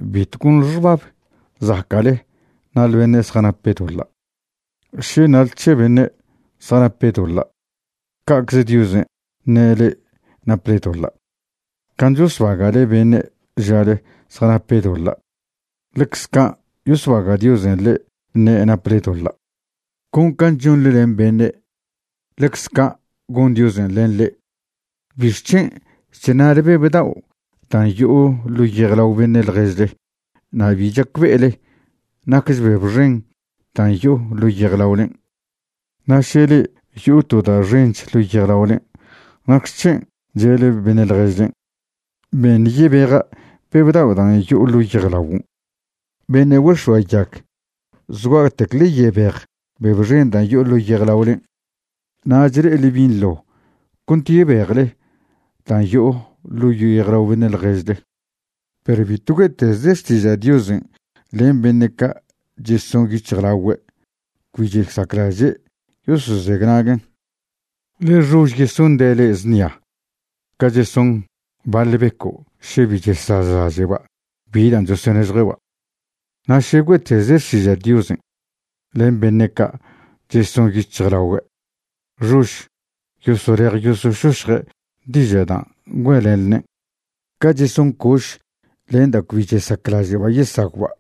’Bitw gonḻe xbab zaca'le ṉale beṉe' zjanape' doḻa'. Še ṉale c̱he beṉe' zjanape' doḻa', ca'cze Diosen' ṉe' le'e naple doḻa'. Can' chosbaga'le beṉe' žale zjanape' doḻa', ḻecze can' yosbaga' Diosen' le'e ṉe' naple doḻa'. Con can' chonḻe len beṉe', ḻecze can' gon Diosen' len le'e. ¿Bixc̱hen' chṉa'le beb dao' dan' yo'o ḻo' yejlao beṉe' ḻježle na' bi chacbe'ele naquech beb xen dan' yo'o ḻo' yejlaolen'? Na' še le'e yo'o to da' xench ḻo' yejlaolen' ¿nacxec̱hen' che'le beṉe' ḻježlen': “Beṉ yebeja' beb dao' dan' yo'o ḻo' yejlaguon'”? ¡Beṉe' güex̱oayag! Zgua'tec ḻe yebej beb xen dan' yo'o ḻo' yejlaolen', nach le'ele binḻo cont yebejle dan' yo'o ḻo' yejlao beṉe' ḻježle. ’Perw bitw güe'tezle xtiža' Diosen' len beṉe' ca' cheson yic̱hjlaogüe' cbi chesaclaže' yosozenaguen', ḻe xož yesonde' le'e znia ca cheson baḻ beco' še bi chazlaže'ba' bi da' chosonežjue'ba'. Na' še güe'tezle xtiža' Diosen' len beṉe' ca' cheson yic̱hjlaogüe', xož yosolej yosošošje' diža' dan' güe'lenḻene'. Ca' cheson coš len da' cbi chesaclaže'ba' yesagwba'.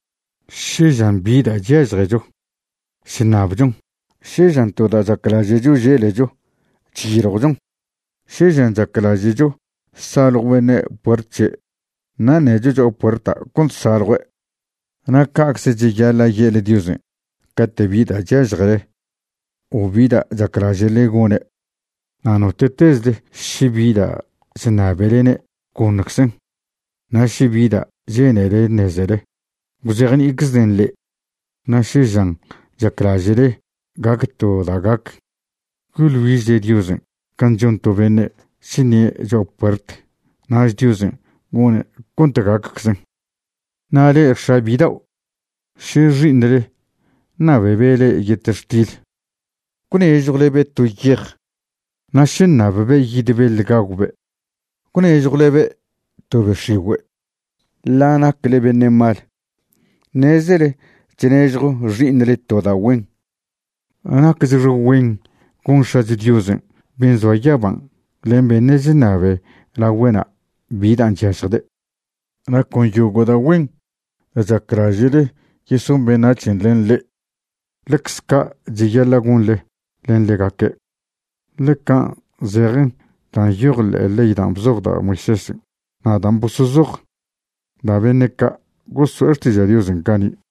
’Še žan bi da' chyažecho, chṉabchon. Še žan to da' chaclaže'cho želecho, chyiljwchon. Še žan chaclaže'cho saljw beṉe' puert c̱he' na' ṉecho cho'a puerta' cont saljue'. Na' ca'cze cheyaḻa' ye'le Diosen' cate' bi da' chyažjele, o bi da' chaclaže'le gone'. Na' note'tezle še bi da' chṉabelene', goṉczen'. Na' še bi dan' che'nele ṉezele, gwzejni'iczden' le'e. Na' še žan chaclaže'le gac to da' gac, yoḻ güižle Diosen' can' chon to beṉe' chṉie' cho'a puert, nach Diosen' gone' cont gacczen. ’Na' le'e x̱a bidao', še xi'iṉle ṉabebe' le'e yetextil ¿gwnežjwlebe' to yej? Na' še ṉabbe' yid beḻ gagwbe', ¿gwnežjwlebe' to be x̱igüe'? Ḻa' nacle beṉe' mal, ṉezele chnežjo xi'iṉle to da' güen. Nacchxe güen gon X̱acho Diosen' ben' zoa yaban' len beṉe' chṉab lagüe'na' bi dan' chyažjde'. ’Na' con yogo' da' güen da' chaclaže'le yeson beṉac̱hen' len le'e, ḻecze ca' cheyaḻa' gonḻe len ḻegaque', ḻe can' zejen da' nyoj ḻe'e ley dan' bzoj da' Moisésen' na' dan' bosozoj da' beṉe' ca' goso'e xtiža' Diosen' cani'.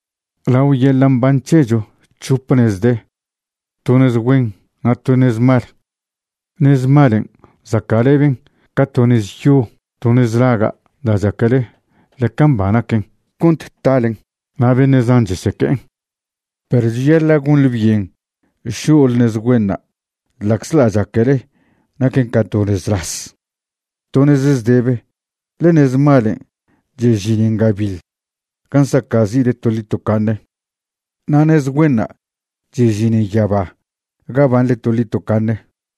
’Lao yeḻa' mban c̱hecho c̱hope nez de, to nez güen na' to nez mal. Nez malen' zaca'leben ca to nez yo to nez laga' dan' chaquele ḻeca mba naquen cont talen, na' beṉe' zan cheseque'en. Perw cheyaḻa' gonḻe byen šo'le nez güenṉa' ḻa'czḻa' chaquele naquen ca to nez las, to nez zdebe, ḻe nez malen' chežinen gabiḻ gan' saca'zi'le toḻi tocaṉe. Na' nez güenṉa' chežinen yaba ga banḻe toḻi tocaṉe.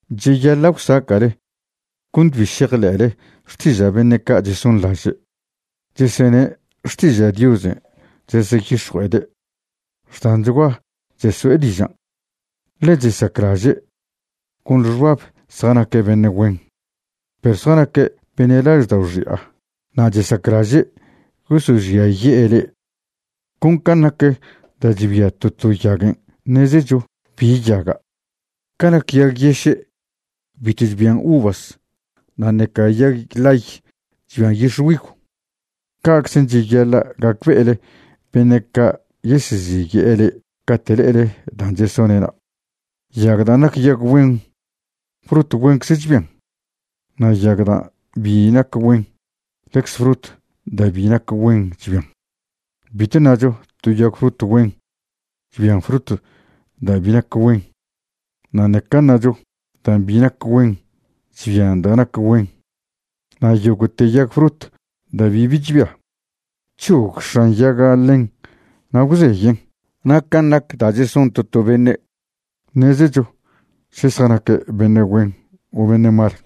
’Cheyaḻa' gwsaca'le cont bi šejḻe'le xtiža' beṉe' ca' chesonḻaže' chesene' xtiža' Diosen' cheseyix̱jue'ede'. Xdanchgua cheso'e dižan', ḻe chesaclaže' gonḻe xbab zjanaque' beṉe' güen. Perw zjanaque' beṉe' laždao' xi'a na' chesaclaže' yosožiaye'e le'e. Con can' nac da' chbia to to yaguen' ṉezecho bi yaga'. Ca nac yag yeše' bitw chbian uvas na' ṉeca yag ḻay chbian yixgüigw. Ca'czen' cheyaḻa' gacbe'ele beṉe' ca' yeseziye'e le'e cate' le'ele dan' chesone'na'. Yag dan' nac yag güen, frut güencze chbian, na' yag da' bi nac güen, ḻecze frut da' bi nac güen chbian. Bitw ṉacho to yag frut güen chbian frut da' bi nac güen, na' ṉeca ṉacho dan' bi nac güen chbian da' nac güen. Na' yogo'te yag frut da' bibi chbia, c̱hog x̱an yaga' ḻen na' gwzeyen'. Na' can' nac dan' cheson to to beṉe', ṉezecho še zjanaque' beṉe' güen o beṉe' mal.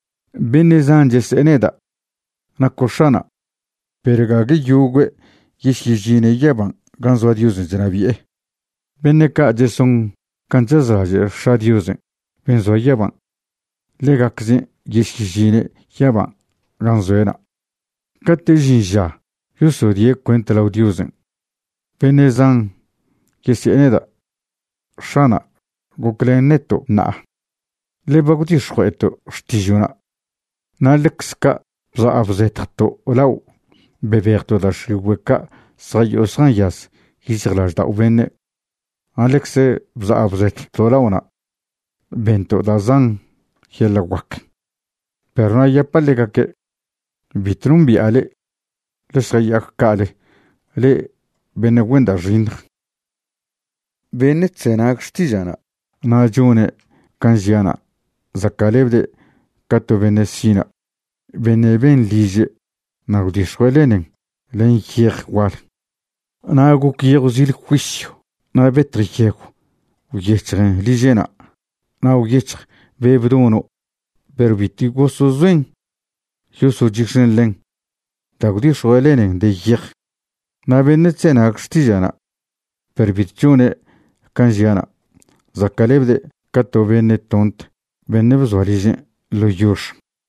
’Beṉe' zan chese'e neda': “Naco' X̱ana'”, perw gague yogüe' yesyežine' yaban' gan' zoa Diosen' chnabi'e. Beṉe' ca' cheson can' chazlaže' X̱a' Diosen' ben' zoa yaban', ḻegaczen' yesyežine' yaban' gan' zoe'na'. Cate' žin ža yosodie' cuent lao Diosen', beṉe' zan yesi'e neda': “X̱ana', goclen neto' ṉa'a, ḻe ba gwdix̱jue'eto' xtižo'na'. Na' ḻecze ca' bza' bzetjto' lao' bebejto' da' x̱igüe' ca' zjayo'o zjanyaz yic̱hjlaždao' beṉe'. Na' ḻecze bza' bzetjto' lao'na' bento' da' zan yeḻa' guac.” Perw na' yapa' ḻegaque': “Bitw nombi'a le'e. Ḻe šjaya'ac ca'ale le'e beṉe' güen da' xiṉj.” ’Beṉe' chzenag xtiža'na' na' chone' can' žia'na' zaca'lebde' ca to beṉe' sina' beṉe' ben liže' na' gwdix̱jue' lenen len yej gual. Na' goc yejw zil juisyw na' betj yegw gwyec̱hjen liže'na' na' gwyec̱hj be' bdono'. Perw bitw gosezoen yosochix̱en ḻen dan' gwdix̱jue' lenen de yej. Na' beṉe' chzenag xtiža'na' perw bitw chone' can' žia'na', zaca'lebde' ca to beṉe' tont beṉe' bzoa ližen' ḻo yox.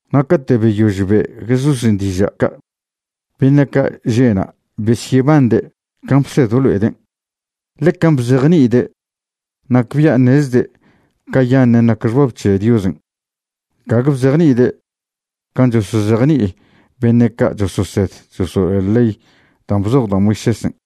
Na' cate' beyož be' Jesúsen' diža' ca', beṉe' ca' že' na' besyebande' can' bsed blo'eden'. Ḻe can' bzejni'ide' nacbia' ṉezde' cayaṉen' nac xbab c̱he Diosen', gague bzejni'ide' can' chosozejni'i beṉe' ca' chososed chosolo'e ley dan' bzoj da' Moisésen'.